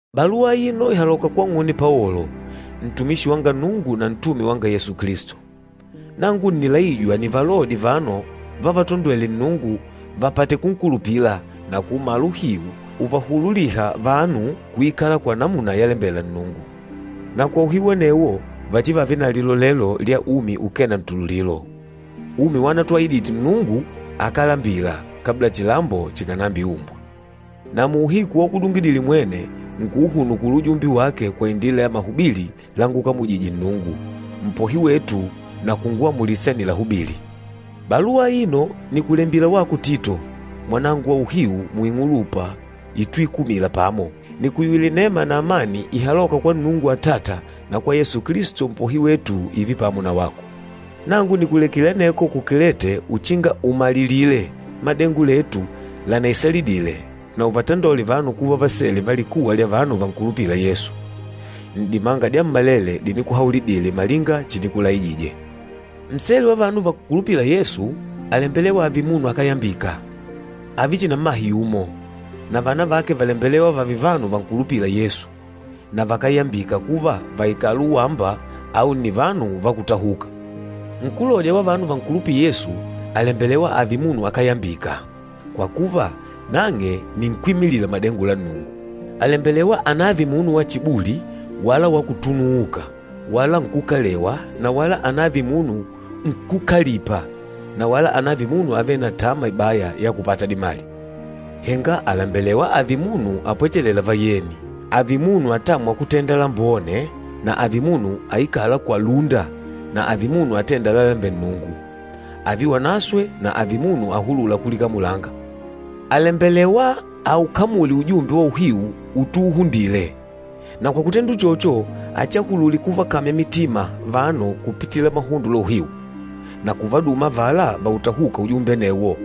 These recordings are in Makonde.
Baluwa aino ìhaloka kwang'une Paolo, ntumishi wa Nnungu na ntume wanga Yesu Kilisto. Nangu ǹnilaijwa nivalodye vanu vavatondwêle Nnungu vapate kunkulupila na kuumala uhiu uvahululîha vanu kuikala kwa namuna yalembela Nnungu. Na kwa uhiu anewo vachivave na lilolelo lya umi ukee na ntululilo, umi wanatuahidite Nnungu akálambila, kabla chilambo chikànambiumbwa. Na muuhiku waukudungidile mwene, nkuuhunukula ujumbe wake kwa indila ya mahubili lángukamujìjè Nnungu, Mpohi wetu na kunguamulisa nilahubili. Baluwa aino nìkulembila wako Tito, mwanangu wa uhiu muing'ulupa ituikumila pamo. Nìkuyuwila inema na amani ihalôka kwa Nnungu Atata na kwa Yesu Kilisto Mpohi wetu, ììve pamo na wako. Nangu nìkulekile aneko ku Kilete uchinga umalilile madengo letu lanaisalidile na uvatandole vanu kuva vasele va likuwa lya vanu vankulupîla Yesu, n'dimanga dyammalele dinikuhaulidile malinga chinikulaijije. Nsele wa vanu vankulupîla Yesu àlembelewa ààve munu akáyambika. Ààve chihi na mmahe yumo, na vana vake vàlembelewa vààve vanu vankulupîla Yesu, na vakáyambika kuva vàikala uwamba au nni vanu vakútahuka. Kwa kuva, nkúlodya wa vanu vankulupîla Yesu àlembelewa ààve munu akáyambika, kwa kuva, nang'e nni nkwímilila madengo la Nnungu. Àlembelewa anààve munu wa chibuli wala wa kutunuuka wala nkúkalewa na wala anààve munu nkúkalipa na wala anààve munu avêle na tama ibaya ya kupata dimali. Henga àlembelewa ààve munu apwechelêla vayeni, ààve munu atâmwa kutenda lambone na ààve munu aikâla kwa lúnda na ààve munu atênda lalalembela Nnungu, ààve wanaswe na ààve munu ahulûla kulikamulanga. Àlembelewa aukamule ujumbe wa uhiu utuuhundile. Na kwa kutenda uchocho, achiahulule kuvakamya mitima vanu kupitila mahundo la uhiu, na kuvaduma avala vautahûka ujumbe anewo.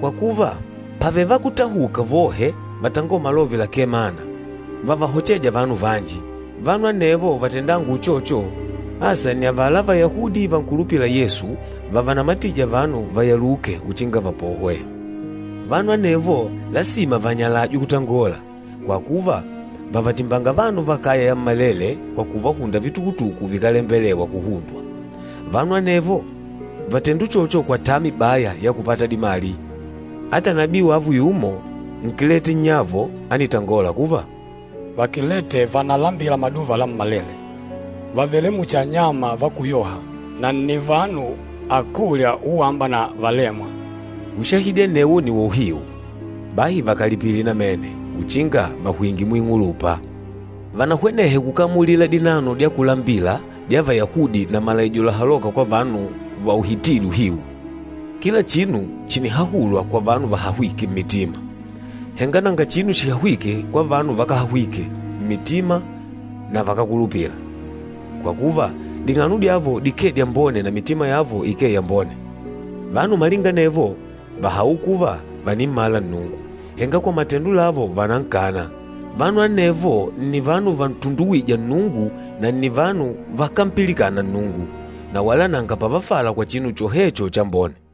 Kwa kuva, pàvele vakútahuka vohe vatangôla malove lakee mana, vavahochêja vanu vanji. Vanu anevo vatendânga uchocho, asa nni avala Vayahudi vankulupîla Yesu, vavanamatîja vanu vayaluke uchinga vapohwe. Vanu anevo lasima vanyalajwe kutangola, kwa kuva, vàvatimbanga vanu va kaya yammalele kwa kuvahunda vitukutuku vikálembelewa kuhundwa. Vanu anevo vàtenda uchocho kwa tama ibaya ya kupata dimali. Ata nabii wavo yumo, Nkilete nnyavo, ánitangola kuva, “Vakilete vànalambila maduva lammalele, vàvele muchi anyama vakúyoha, na nni vanu akúlya uwamba na valêmwa!” Ushahidi anewo nni wa uhiu. Bahi vakalipile namene, uchinga vahwinge muing'ulupa. Vanahwenehe kukamulila dinano dya kulambila dya Vayahudi na malaijo lahalôka kwa vanu vauhitîle uhiu. Kila chinu chìnihahulwa kwa vanu vahahwîke mmitima, henga nanga chinu chihahwîke kwa vanu vakáhahwike mmitima na vakákulupila. Kwa kuva, ding'ano dyavo dikee dyambone na mitima yavo ikee yambone. Vanu malinga anevo vàhaula kuva vànimmala Nnungu, henga kwa matendo lavo vànankana. Vanu anevo nni vanu vantunduwîja Nnungu na nni vanu vakámpilikana Nnungu, na wala nanga pavafala kwa chinu chohecho chambone.